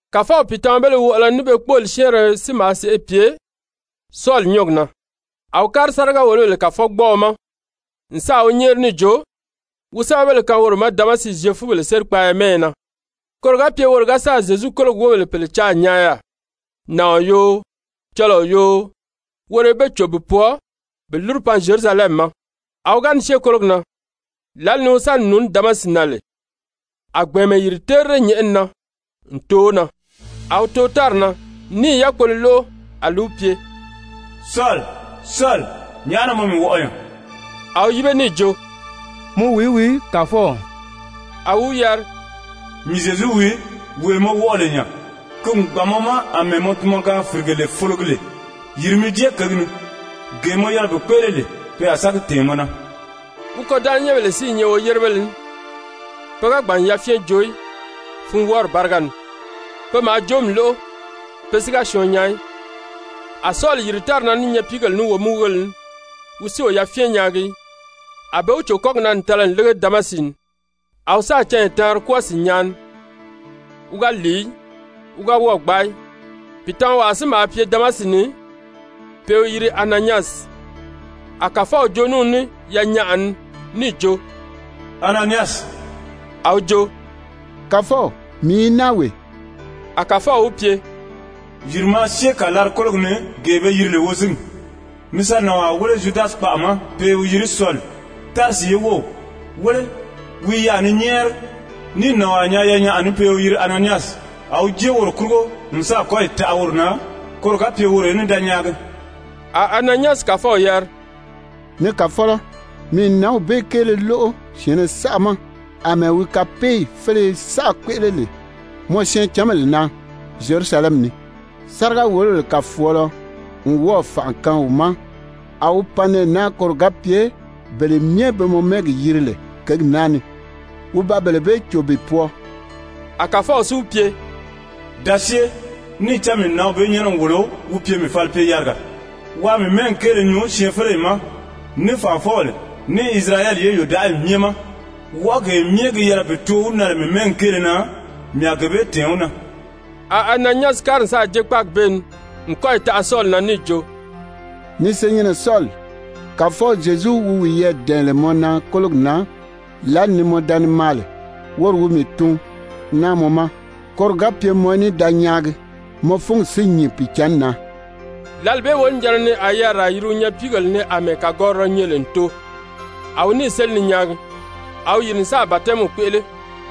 Kàfɔw pìitamabéle wɔʔɔlɔ ní be kpóoli syɛ́ɛnrɛ si maa sèʔê pye Sɔli nyɔ́ɔgi na, a wi kári sáriga-wòlobèle kàfɔgbɔɔɔ ma n sáà wi nyɛ́ɛri níì jo wi sɛ́bɛbéle kaan woro ma Damasi Zyefubèle sérikpaaya mɛ́ɛyɛ na, koro ga pye woro ga sáà Zyezu kólogi wóbèle pèle caa n nyaa yaà, nàɔn yoo, cɔlɔɔ yoo, woro í be cò bi pwɔɔ bi lúru pan Zyerusalɛmi ma. A wi ga ni syée kólogi na, lǎli ni wi sa ni nùuní Damasi na lè, a gbɛ̀ɛnmɛ yìri terire nyɛ̀ʔɛni na n too wi na. A wi too tári na níì yákpolo lóʔo a li wi pye: «Sɔli, Sɔli, nyàʔá na mɔ mii wɔʔɔ nya?» A wi yíbe níì jo: «Mɔ wìí wii, Kàfɔw?» A wi wi yari: «Mii Zyezu wii, wee mɔ wɔʔɔ lè nya. [Ki n gbàn mɔ ma àmɛɛ mɔ tunmɔgaan-fìrigele fologi lè.] Yìri mi jée kěgi ni, gee mɔ yɛlɛ bi kpéʔele lè, pe a sa gi tɛ̀ɛn mɔ na.» Wi kôdanʔanyɛnbèle si i nyɛ woyérebéle ní, pe ga gbàn n yafyɛn joo í funwɔɔri báriga ni. Pe maa joomi lóʔo, pe si ga syɔɔn nyaa í. A Sɔli yìri tári na ní nyapiigèle ní womúgugéle ní, wi si o yafyɛn nyaagi í. A be wi cò kɔ́gi na n tala n lége Damasi ni. A wi sáà canya taanri kwɔ́ɔ sìnnyaa ni, wi ga lìi í, wi ga wɔ́ɔ̀ gbaa í. Pìitamawaa si maa pye Damasi ni, pe i wi yiri Ananyasi. A Kàfɔw joo ní wi ní yanyaʔa ni níì jo: «Ananyasi.» A wi jo: «Kàfɔw, mii i naa wee.» A Kàfɔw wi pye: «Yìri maa syée kàlari-kólogi ni gee be yiri lè wozingi, mi sa nànwaa wéle Zyudasi kpaʔa ma, pe i wi yiri Sɔli, Tarisi ye wów. Wéle, wi i yaà ni nyɛ́ɛri, níì nànwaa nyaa yanyaʔa ni pe i wi yiri Ananyasi, a wi jée woro kurugo n sáà kɔ́yi taʔa woro na, koro ga pye woro í ní da nyaagi.» A Ananyasi Kàfɔw yari: «Ni Kàfɔlɔ, mii n nǎnw bee kéele lóʔo syɛ̀ɛnnɛ saʔa ma àmɛɛ wi kapeeyi féleye saʔa kpéʔele lè mɔ syɛɛncanbèle na Zyerusalɛmi ni. Sáriga-wòlobèle kàfɔɔlɔ n wɔ́ɔ̀ fànʔa kaan wi ma a wi pan nɛɛ naa koro ga pye bele myɛ be mɔ mɛ́ɛgi yiri lè kěgi naa ni, wi ba bele bee cò bi pwɔɔ.» A Kàfɔw si wi pye: «Da syée, níì cán mii n nǎnw bee nyɛ́nɛ n wòlo wi pye mii falipye-yariga waa mii mɛ́ɛgi kéele nyuu syɛɛnfeleyi ma, ní fànʔafɔbèle, ní Isirayɛli ye yòdaʔayi myɛ ma. Wɔʔɔgee myɛ gi yɛlɛ bi too wi na lè mii mɛ́ɛgi kéele na, mii a gee bee tɛ̀ɛn wi na.» A Ananyasi kári n sáà jée kpáagi bee ni n kɔ́yi taʔa Sɔli na níì jo: «Ni senyɛnnɛ Sɔli, Kàfɔw Zyezu wi wiyɛɛ dɛ̀ɛn lè mɔ na kólogi na lǎli ni mɔ da ni maa lè, woro wi mii tun naa mɔ ma, koro ga pye mɔ í ní da nyaagi, mɔ fúngi si nyìn Pìicǎnni na.» Lǎli bee wonijanna ni a yariraa yiri wi nyapiigèle ni àmɛɛ kàgɔrirɔ nyɛ lè n too, a wi níì séli ni nyaagi. A wi yìri n sáà batɛmiw kpéʔele.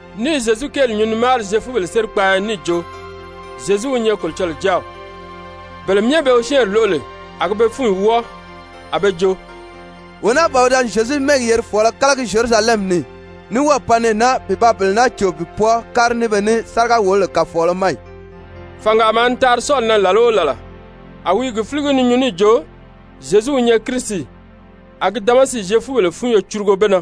ní i Zyezu kéeli nyuu ni máari Zyefubèle sérikpaaya ni níì jo: «Zyezu wi nyɛ Kolocɔlɔɔ Jáaw.» Bele myɛ be wi syɛ́ɛnri lóʔo lè, a gi be fúnyi wɔ́ɔ a be jo: «Wee naa ban wi da ni Zyezu mɛ́ɛgi yerifɔɔlɔ kálagi Zyerusalɛmi ni ì, ní wɔ́ɔ̀ pan nɛɛ naa bi ba bele naa cò bi pwɔɔ kári ní be ní sáriga-wòlobèle kàfɔɔlɔ ma ì?» Fàngaa maa ni taari Sɔli na làla o làla, a wi i gi fíligi ni nyuu níì jo Zyezu wi nyɛ Kirisi, a gi Damasi Zyefubèle fúnyo curugo be na.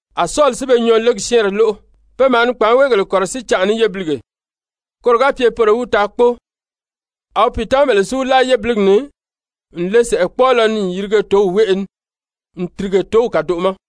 a Sɔli si be nyɔɔlegi syɛ́ɛnrɛ lóʔo. Pe maa ni kpàánweegèle kɔ̀rɔsíi canʔa ní yébilige, koro ga pye poro í wi taa kpóo. A wi pìitamabèle si wi láa yébiligi ni n le sɛ̀ʔɛkpɔɔlɔ ni n yirige tǒw wéʔe ni n tìrige tǒw kàdoʔo ma.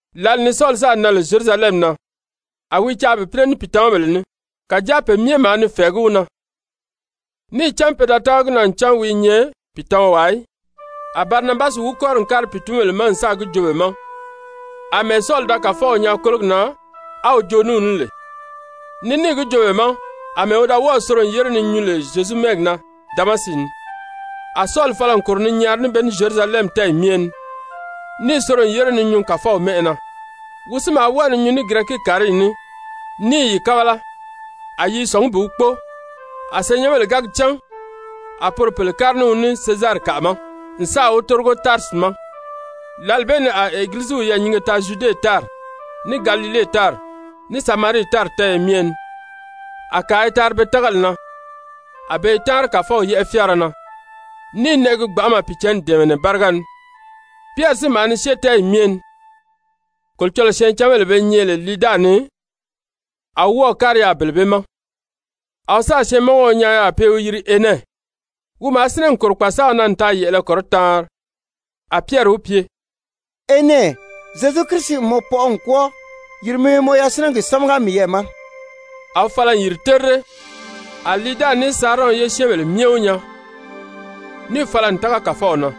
Lǎli ni Sɔli sáà nan lè Zyerusalɛmi na, a wi i caa bi pínɛ ní pìitamabèle ní, kàjáa pe myɛ maa ni fɛ̀ɛgí wi na, níì cán pe da tága gi na ncan wi i nyɛ pìitamawaa í. A Barinabasi wi kɔ́ri n kári pìitunbèle ma n sáà gi joo be ma àmɛɛ Sɔli da Kàfɔw nyaa kólogi na á wi joo ní wi ní lè, ní níì gi joo be ma àmɛɛ wi da wɔ́ɔ̀ soro n yére ni nyuu lè Zyezu mɛ́ɛgi na Damasi ni. A Sɔli fala n kòro ni nyaari ní be ní Zyerusalɛmi tɛ́ɛyi myɛ ni, níì soro n yére ni nyuu Kàfɔw mɛ́ʔɛ na. Wi si maa wɔ́ɔ ni nyuu ní Girɛki-kàriyi ní, ní i yi kábala, a yi i sɔ̀ngí bi wi kpóo. A senyɛnbèle ga gi cán, a poro pèle kári ní wi ní Sezarikaʔa ma n sáà wi tórigo Tarisi ma. Lǎli bee ni a Egiliziw yɛɛ̀nyinge taa Zyude tári, ní Galile tári, ní Samarii tári tɛ́ɛyɛ myɛ ni. A kàa i taari be tágali na, a be i táanri Kàfɔw yɛ́ʔɛ fyáara na, ní i nɛʔɛgi gbanʔama Pìicǎnni dɛ̀ɛmɛnɛ báriga ni. Pyɛri si maa ni syée tɛ́ɛyi myɛ ni. Kolocɔlɔɔ syɛɛncanbèle be nyɛ lè Liida ni, a wi wɔ́ɔ̀ kári yaà bele bee ma. A wi sáà syɛɛnmɔngɔɔ nyaa yaà pe i wi yiri Enɛ, wi maa sínɛ n kòro kpàsaaw na n taa yɛ̀ʔɛlɛ kɔrɔtaanri. A Pyɛri wi pye: «Enɛ, Zyezu Kirisi n mɔ pɔʔɔ n kwɔ́ɔ. Yìri mi mɔ yasinɛgi sámaga miyɛɛ ma.» A wi fala n yìri terire. A Liida ní Sarɔn ye syɛ́ɛnbèle myɛ wi nyaa, níì fala n tága Kàfɔw na.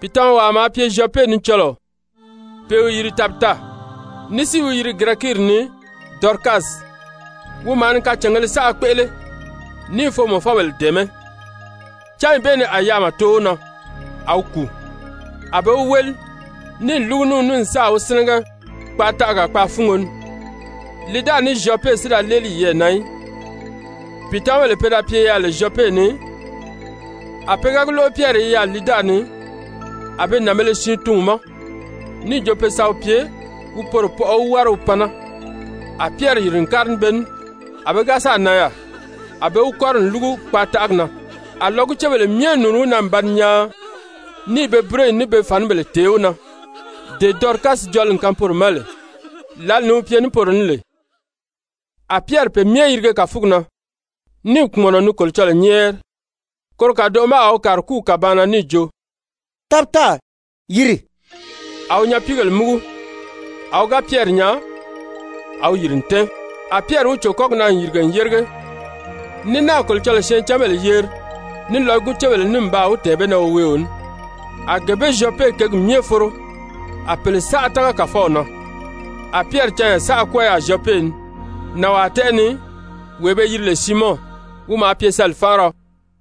Pìitamawaa maa pye Zyɔpe ni cɔlɔɔ, pe i wi yiri Tabita, ní si i wi yiri Girɛkiiri ni Dɔrikasi. Wi maa ni kacàngēle saʔa kpéʔele, ní i foomɔfɔbèle dɛ̀ɛmɛ́. Cányi bee ni a yaama too wi na, a wi kùu. A be wi wéli, níì lúgu ní wi ní n sáà wi sínɛgɛ kpaataʔaga kpaafungo ni. Liida ní Zyɔpe si da léeli yiyɛɛ na í, pìitamabèle pe da pye lè Zyɔpe ni, a pe ga gi lóʔo Pyɛri i yaà Liida ni, a be nànbēle siin tun wi ma níì jo pe sa wi pye wi poro pɔʔɔ wi wári wi pan naa. A Pyɛri yìri n kári ní be ní. A wi ga sáà nan yaà, a be wi kɔ́ri n lúgu kpaataʔagi na. A lɔgucebèle myɛ nùuni wi na n ba ni nyaan, ní i be búroyi ní be fànibèle tèé wi na dee Dɔrikasi jɔli n kaan poro ma lè, lǎli ni wi pye ní poro ní lè. A Pyɛri pe myɛ yirige kàfugi na, níì kpùmɔnɔ ni Kolocɔlɔɔ nyɛ́ɛri. Koro kàdoʔo ma a wi kàri kúw kàbaan na níì jo: «Tabita, yìri!» A wi nyapiigèle múgu, a wi ga Pyɛri nyaa, a wi yìri n tɛ́ɛn. A Pyɛri wi cò kɔ́gi na n yìrige n yérige, ní náà Kolocɔlɔɔ syɛɛncanbèle yeri ní lɔgucebèle ní n baa wi tɛ̀ɛn be na woweeo ní. A gee bee Zyɔpe kěgi myɛ foro, a pèle saʔa tága Kàfɔw na. A Pyɛri canya saʔa kwɔ́ɔ yaà Zyɔpe ni, nànwaa tɛ́ʔɛ ni, wee be yiri lè Siimɔn, wi maa pye sali-fánʔariɔ.